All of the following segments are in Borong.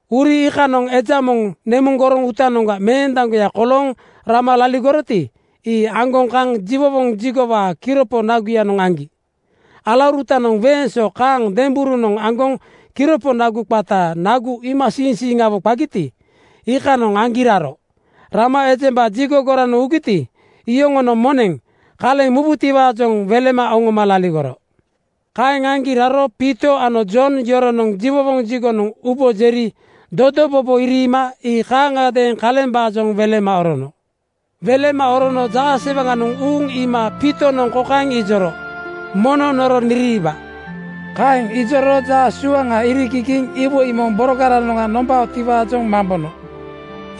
Uri iikanoŋ eja moŋ nemuŋ goroŋ uutanoŋga meendaŋgoya kolooŋ rama laligoroti, ii aŋgoŋ kaŋ jiwowoŋ jigowaa kiropo naguyanoŋ aŋgi. Alaurutanoŋ weeŋ so kaŋ demberunoŋ aŋgoŋ kiropo nagu qata Nagu Iimasiiŋsiiŋawo qagiti, iikanoŋ aŋgi raro. Rama ejemba jigo goranoŋ ugiti, iyoŋonoŋ moneŋ kaleŋ mubutiwaajoŋ welema oŋoma laligoro. Kaeŋ aŋgi raro Piito ano Jon yoronoŋ jiwowoŋ jigonoŋ ubo jeri dodobobo iriima ii kaaŋadeeŋ kalembaajoŋ welema orono. Welema orono jaasewaŋanoŋ uuŋ iima Piitonoŋ kokaeŋ ijoro, “Mono noro niriiba.” Kaeŋ ijoro jaa suaŋa irigigiiŋ iwoi moŋ borogaranoŋga nombaotiwaajoŋ mambono.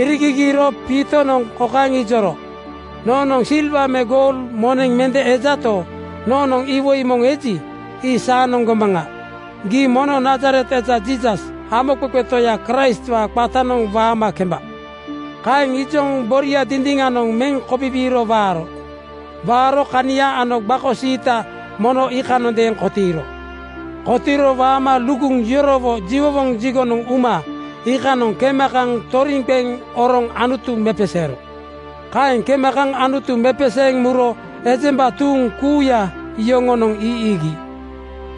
Irigigiiro Piitonoŋ kokaeŋ ijoro, “Noonoŋ silwa me goul moneŋ mende ejato, noonoŋ iwoi moŋ eji, ii saanoŋ gomaŋa: Gii mono Nazaret eja Jiisas, Hamoqeqe Toya Kraistwaa qatanoŋ waama kemba!” Kaeŋ ijoŋ boria dindiŋanoŋ meŋ kobibiiro waaro. Waaro kania ano gbako siita mono iikanondeeŋ kotiiro. Kotiiro waama luguŋ yorowo jiwowoŋ jigonoŋ uma iikanoŋ kema kaŋ toriŋ qeŋ oroŋ Anutu mepeseero. Kaeŋ kema kaŋ Anutu mepeseeŋ muro ejemba tuuŋ kuuya yoŋonoŋ ii iigi.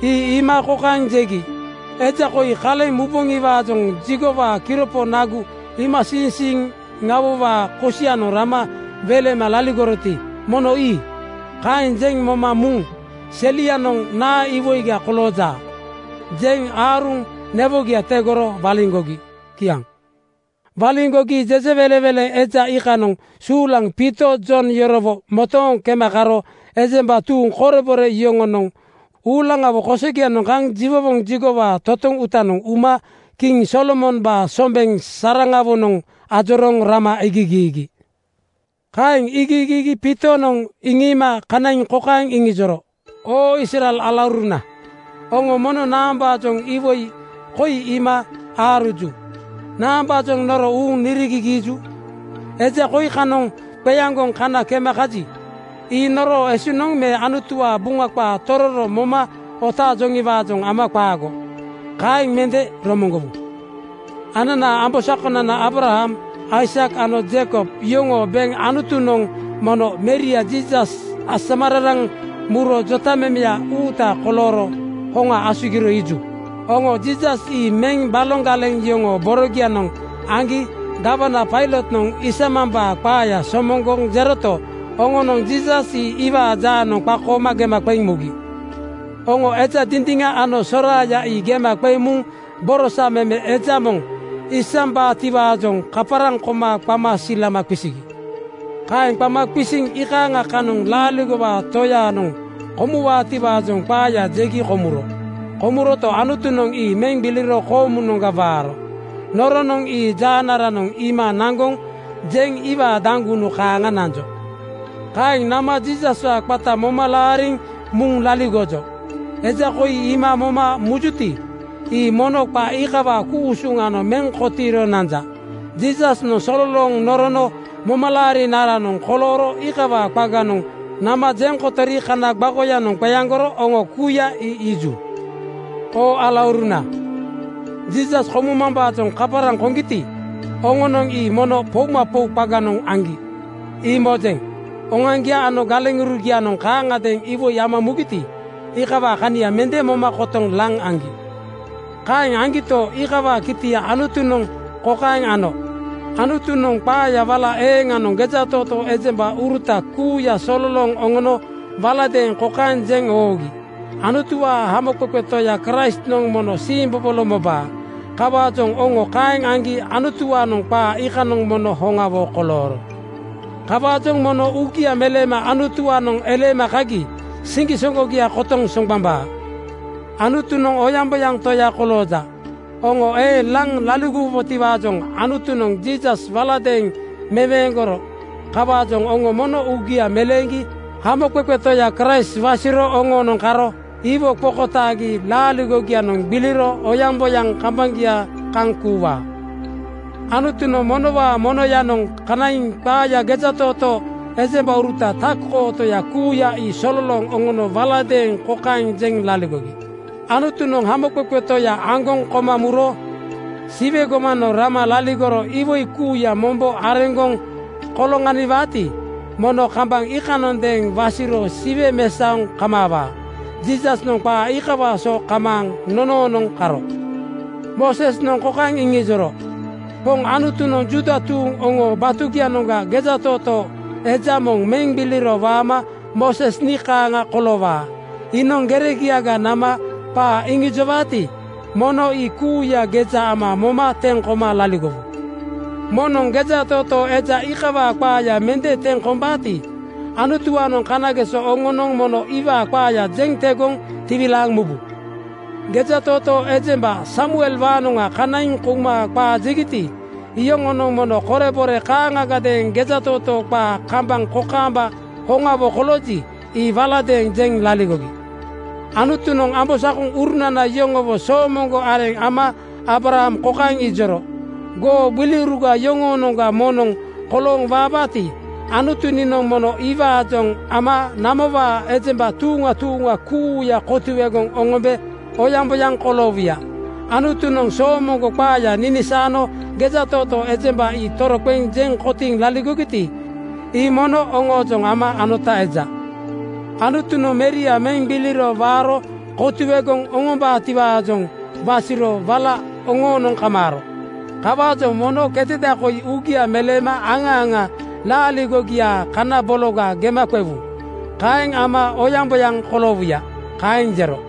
Ii iima kokaeŋ jegi, “Eja koi kaleŋ muboŋiwaajoŋ jigowaa kiropo Nagu Iimasiiŋsiiŋa-wowaa kosianoŋ rama welema laligoroti, mono ii.” Kaeŋ jeŋ moma muŋ “Selianoŋ naa iwoiga kolooja?” jeŋ aaruŋ newogia tegoro waliŋgogi. Kiaŋ. Waliŋgogi jejewelenweleŋ eja iikanoŋ suulaŋ Piito Jon yorowo motooŋ kema karo ejemba tuuŋ korebore yoŋonoŋ uulaŋawo kosogianoŋ kaŋ jiwowoŋ jigowaa totoŋ uutanoŋ uma kiŋ Solomombaa sombeŋ saraŋawonoŋ ajorooŋ nama iigigiigi. Kaeŋ iigigiigi Piitonoŋ iŋiima kanaiŋ kokaeŋ iŋijoro, “Oo Israel alauruna, oŋo mono naambaajoŋ iwoi koi iima aaruju? Naambaajoŋ noro uuŋ nirigigiiju? Eja koi kanoŋ qeaŋgoŋ kana kema kaji, ii noroo esuŋnoŋ me Anutuwaa Buŋa qaa tororo moma otaaŋkejotiwaajoŋ ama qaago. Kaeŋ mende romoŋgowu. Ananaa ambosakonana Aabraham, Aisak ano Jeikob yoŋoo beŋ Anutunoŋ mono Meria Jiisas asamararaŋ muro jotamemeya uuta kolooro hoŋa asugiro iiju. Oŋo Jiisas ii meŋ baloŋ galeŋ yoŋoo borogianoŋ aŋgi gawana Pailotnoŋ isamambaa qaaya somoŋgoŋ jeroto, oŋonoŋ Jiisas ii iwaa jaanoŋ qakooma gema qeŋ mugi. “Oŋo eja dindiŋa ano soraaya ii gema qeŋ muŋ borosa meme eja moŋ isambaatiwaajoŋ kaparaŋ koma qama silama qisigi. Kaeŋ qama qisiŋ iikaaŋa kanoŋ laaligowaa Toyanoŋ komuwaatiwaa qaaya jegi komuro. Komuroto, Anutunoŋ ii meŋ gbiliro koomunoŋga waaro. Noronoŋ ii jaanaranoŋ iima naŋgoŋ jeŋ iwaa daŋgunu kaaŋa nanjo. Kaeŋ nama Jiisaswaa qata moma laariŋ muŋ laligojo. Eja koi iima moma mujuti, ii mono qa iikawaa ku-usuŋanoŋ meŋ kotiiro nanja. Jiisasnoŋ sololooŋ norono momalaarinaranoŋ kolooro iikawaa qaganoŋ nama jeŋ kotori kana gbakoyanoŋ qeaŋgoro oŋo kuuya ii iiju. “Oo alauruna, Jiisas komumambaajoŋ kaparaŋ koŋgiti, oŋonoŋ ii mono poumapou qaganoŋ aŋgi, ii mojeŋ. Oŋoaŋgia ano galeŋurugianoŋ kaaŋagadeeŋ iwoi ama mugiti, iikawaa kania mende moma kotoŋ laŋ aŋgi. Kaeŋ aŋgito, iikawaa kitia Anutunoŋ kokaeŋ ano: Anutunoŋ qaaya wala eeŋanoŋ gejatootoo ejembauruta kuuya sololooŋ oŋono waladeeŋ kokaeŋ jeŋ oogi, ‘Anutuwaa Hamoqeqe Toya Kraistnoŋ mono siimbobolo mobaa.’ Kawaajoŋ oŋo kaeŋ aŋgi Anutuwaanoŋ qaa iikanoŋ mono hoŋawo kolooro. Kawaajoŋ mono uugia meleema Anutuwaanoŋ eleema kagi siŋgisoŋgogia kotoŋ soŋgbambaa. “Anutunoŋ oyaŋboyaŋ Toya kolooja. Oŋo eeŋ laŋ laligowubotiwaajoŋ Anutunoŋ Jiisas waladeeŋ meweeŋgoro. Kawaajoŋ oŋo mono uugia meleeŋgi Hamoqeqe Toya Kraist wasiro oŋoonoŋ karo iwo qokotaagi laaligogianoŋ gbiliro oyaŋboyaŋ kambaŋgia kaŋ kuuwaa. Anutunoŋ monowaa monoyanoŋ kanaiŋ qaaya gejatootoo ejembauruta tak-kootoya kuuya ii sololooŋ oŋono waladeeŋ kokaeŋ jeŋ laligogi, ‘Anutunoŋ Hamoqeqe Toya aŋgoŋ koma muro Siwe gomanoŋ rama laligoro iwoi kuuya mombo areŋgoŋ koloŋaniwaati, mono kambaŋ iikanoŋadeeŋ wasiro Siwe mesaoŋ kamaawaa.’ Jiisasnoŋ qaa iikawaa so kamaaŋ nonoonoŋ karo. Moosesnoŋ kokaeŋ iŋijoro, ‘Poŋ Anutunoŋ Juuda tuuŋ oŋoo batugianoŋga gejatootoo eja moŋ meŋ gbiliro waama Mooses nii kaaŋa koloowaa. Iinoŋ geregiaga nama qaa iŋijowaati, mono ii kuuya geja ama moma teŋ koma laligowu. Moŋnoŋ gejatootoo eja iikawaa qaaya mende teŋ kombaati, Anutuwaanoŋ kanageso oŋonoŋ mono iwaa qaaya jeŋ tegoŋ tiwilaaŋ mubu.’ Gejatootoo ejemba Samuelwaanoŋa kanaiŋ kouma qaa jegiti, iyoŋonoŋ mono korebore kaaŋagadeeŋ gejatootoo qaa kambaŋ kokaamba hoŋawo kolooji, ii waladeeŋ jeŋ laligogi. Anutunoŋ ambosakoŋurunana yoŋowo soomoŋgo areŋa ama Aabraham kokaeŋ ijoro, ‘Goo gbiliuruga yoŋoonoŋga moŋnoŋ kolooŋ waabaati, Anutu niinoŋ mono iwaajoŋ ama namowaa ejemba tuuŋa tuuŋa kuuya kotuegoŋ oŋombe oyaŋboyaŋ koloowuya.’ Anutunoŋ soomoŋgo qaaya ninisaano gejatootoo ejembanoŋ ii toroqeŋ jeŋ kotiiŋ laligogiti, ii mono oŋoojoŋ ama anota eja. Anutunoŋ Meria meŋ gbiliro waaro kotuegoŋ oŋombaatiwaajoŋ wasiro wala oŋoonoŋ kamaaro. Kawaajoŋ mono keteda koi uugia meleema aŋa aŋa laaligogiaa kana bologa gema qewu. Kaeŋ ama oyaŋboyaŋ koloowuya.” Kaeŋ jero.